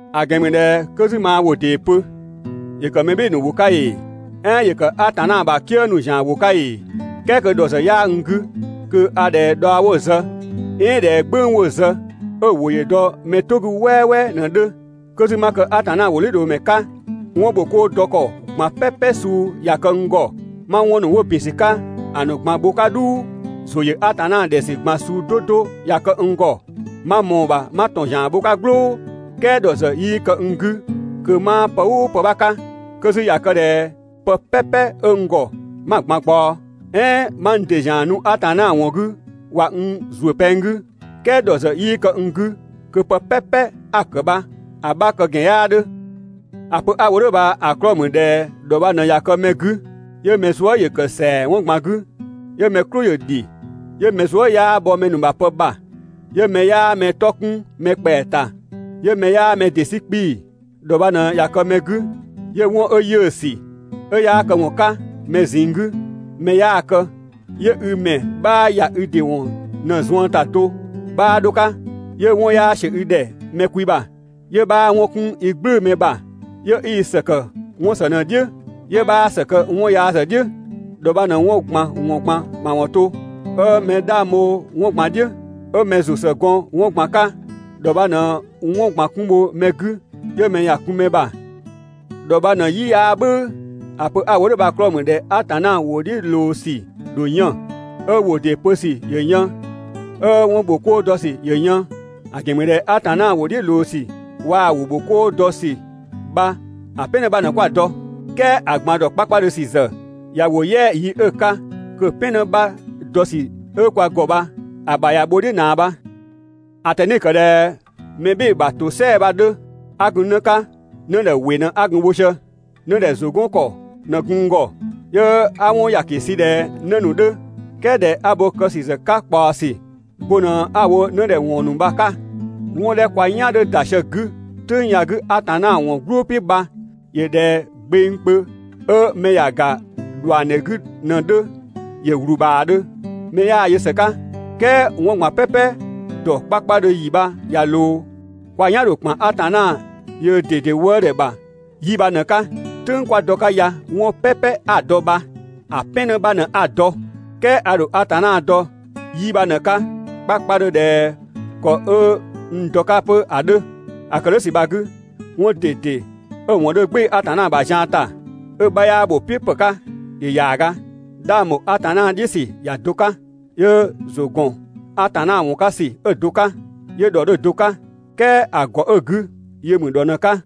(‑A ‑gɛn ‑mü ꞊dhɛ) 'kö 'zü 'ma ‑wʋ ‑dee pö, ‑yö ‑kë mɛ "bhɩɩ‑ ‑nu ‑wʋ 'ka ‑ee, "ɛɛn ‑yö ‑kë Atanna ‑bha "kië ‑nu ‑zian ‑wʋ 'ka ‑ee, "kɛɛ kö ‑dhɔ ‑zë 'yaa n 'gü, kö a ꞊dhɛ dhaɔ 'wo‑ zë, "ɛɛn ꞊dhɛ "gbʋ̈ng 'wo‑ zë 'ö‑ ‑wʋ ‑yö dɔ mɛ "tʋ 'gü "wɛɛwɛɛ ꞊në‑ 'dhö. 'Kö 'zü 'ma kë Atanna ‑wʋdhiʋ̈loomɛ 'ka, 'wɔn ‑bho 'koo dɔ ‑kɔ ꞊gban "pɛpɛ suu ꞊ya kë n ‑gɔ, 'ma 'wɔn ‑nu 'wo ‑bin ‑sü 'ka ‑a ꞊gban bho‑ 'ka "dhuu, ‑zʋ ‑yö Atanna ‑dhɛ ‑sü ꞊gban suu 'do 'do ꞊ya kë n ‑gɔ, 'ma ꞊mɔɔ‑ ‑bha 'ma ‑tɔn ‑zian bho‑ 'ka "gblʋʋ, "kɛɛ ‑dhɔ ‑zë 'yii kë n 'gü kö 'maa pë "ʋʋ ‑pë 'bha 'ka. 'Kö 'zü ꞊ya kë ꞊dhɛ pë "pɛpɛ 'ö n ‑gɔ 'ma‑ ꞊gban ꞊gbaɔ, "ɛɛn 'ma n ‑dɩ ‑zian nu Atanna ‑wɔn 'gü ꞊wa n ‑zuö pɛng 'gü, "kɛɛ ‑dhɔ ‑zë 'yii kë n 'gü, kö pë "pɛpɛ 'a‑ ‑kë bha‑ 'bha kë ‑gɛn 'yaa 'dhö. ‑A pö 'a‑ wo "dhʋ̈ bha‑ 'klɔɔ‑ ‑mü ꞊dhɛ ‑dhɔ bha ꞊në ꞊ya kë mɛ 'gü 'yö mɛ zuë" ‑yö ‑kë ‑sɛa 'wɔn ꞊gban 'gü, 'yö mɛ "klʋ ‑yö ‑dhi, 'yö mɛ zuë" 'yaa bhɔ mɛ ‑nu ‑bha pë ‑bha, 'yö mɛ 'yaa mɛ 'tɔ 'kun mɛ ‑kpɛa ‑ta, 'yö mɛ 'yaa mɛ ‑dɩ 'sü 'kpii‑. ‑Dhɔ bha ꞊në ꞊ya kë mɛ 'gü, 'yö 'wɔn 'ö 'yiʋ̈‑ ‑sü, 'ö 'yaa këwɔn 'ka mɛ ꞊zinng 'gü, mɛ 'yaa‑ kë, 'yö i ‑mɛ 'bhaa ‑ya i ‑dɩ ‑wɔn ꞊në‑ zuën ‑ta do 'bhaa 'dho‑ 'ka, 'yö 'wɔn 'yaa ‑siö i ‑dhɛ mɛ kwi ‑bha, 'yö 'bhaa 'wɔn 'kun i "gblʋ̈ʋ̈‑ mɛ ‑bha; 'yö 'i ‑së ‑kë 'wɔn ‑së ꞊në‑ "dhiʋ̈, 'yö 'bhaa ‑së kë 'wɔn yaa ‑zë "dhiʋ̈. ‑Dhɔ bha ꞊në 'wɔn ꞊gban ‑wɔn ꞊gban ‑mawɔn to, 'ö mɛ 'dhang bho 'wɔn ꞊gban‑ "dhiʋ̈, 'ö mɛ ‑zʋ ‑së gɔn 'wɔn ꞊gban 'ka, ‑dhɔ bha ꞊në 'wɔn ꞊gban 'kun bho mɛ 'gü 'yö mɛ ‑ya kun mɛ ‑bha. ‑Dhɔ bha ꞊në‑ "yi 'yaa "bhʋ̈ʋ̈. ‑A pö 'a‑ wo "dhʋ̈ bha‑ 'klɔɔ‑ ‑mü ꞊dhɛ Atanna ‑wʋ "dhiʋ̈ ꞊loo ‑sü ‑dho yën, 'ö ‑wʋ ‑dee pö ‑sü ‑yö yën, 'ö 'wɔn ‑bho 'koo dɔ ‑sü ‑yö yën. ‑A ‑gɛn ‑mü ꞊dhɛ Atanna ‑wʋ "dhiʋ̈ ꞊loo ‑sü waa‑ 'wɔn ‑bho 'koo dɔ ‑sü bha‑ "pɛn 'në 'bha ꞊në 'kwa‑ dɔ. "Kɛɛ ‑a ꞊gban dɔ 'kpakpadhö ‑sü ‑zë ꞊ya ‑wo "yɛa‑ yi 'ö‑ 'ka kö‑ "pɛn 'në 'bha dɔ ‑sü 'ö kwa ‑gɔ bha‑ ‑bha ꞊ya bho‑ "dhiʋ̈ ꞊naa bha. (‑A ꞊tɛni‑ ‑kë ꞊dhɛ mɛ "bhɩɩ‑ ‑bha ‑tosɛa bha‑ 'dhö) 'a gun 'në 'ka, 'nëdhɛ ‑wɩ ꞊në 'a gun‑ wo sië, 'nëdhɛ ‑zʋ 'gɔn ‑kɔ ꞊në gun n ‑gɔ, 'yö 'a 'wɔn ‑yaki sü ꞊dhɛ 'në ‑nu 'dhö, "kɛɛ ꞊dhɛ 'a bo kë ‑sü ‑zë 'ka ꞊kpaɔsü, bo ꞊në 'a‑ wo 'nëdhɛ ‑wɔn ‑nu bha‑ 'ka. 'Wɔn 'dhɛ 'kö kwa "yan 'dhö ‑da sië‑ 'gü "tʋ̈ng ya‑ 'gü Atanna ‑wɔn "glʋʋ "piʋ̈ bha ‑yö ꞊dhɛ gbengkpö 'ö mɛ ‑ya ‑ga ‑dhuangdhe 'gü ꞊në‑ 'dhö, ‑yö ‑wlubhaadhö, mɛ 'yaa‑ yö ‑së 'ka, "kɛɛ 'wɔn ꞊gban "pɛpɛ ‑dɔ 'kpakpadhö ‑yi bha ꞊ya ꞊loo, kwa "yan ‑dho ‑kpan Atanna yöö ꞊dede wëëdhɛ ‑bha 'yi bha ꞊në‑ 'ka, "tʋ̈ng kwa dɔ‑ 'ka ya 'wɔn "pɛpɛ 'a‑ dɔ bha‑ "pɛn 'në 'bha ꞊në 'a‑ dɔ, "kɛɛ a ‑dho Atanna dɔ 'yi bha ꞊në‑ 'ka 'kpakpadhö ꞊dhɛ ‑kɔ 'ö n dɔ‑ 'ka 'pö ‑a 'dhö. ‑A ‑kë "dhʋ̈ ‑sü bha‑ 'gü, 'wɔn ꞊dede 'ö‑ ‑wɔn 'dhö "gbɩɩ‑ Atanna ‑bha zian ‑ta, 'ö‑ 'bha 'yaa ‑bho "piʋ̈ ‑pë 'ka ‑yö ‑yaaga. 'Dhang ‑bho Atanna "dhiʋ̈ ‑sü ‑ya do 'ka, 'yö ‑zʋ ‑gɔn Atanna ‑wɔn 'ka ‑sü 'ö‑ do 'ka, 'yö ‑dhɔ 'dhö‑ do 'ka, "kɛɛ ‑a ‑gɔ 'ö‑ 'gü yö ‑mü ‑dhɔ ꞊në‑ 'ka.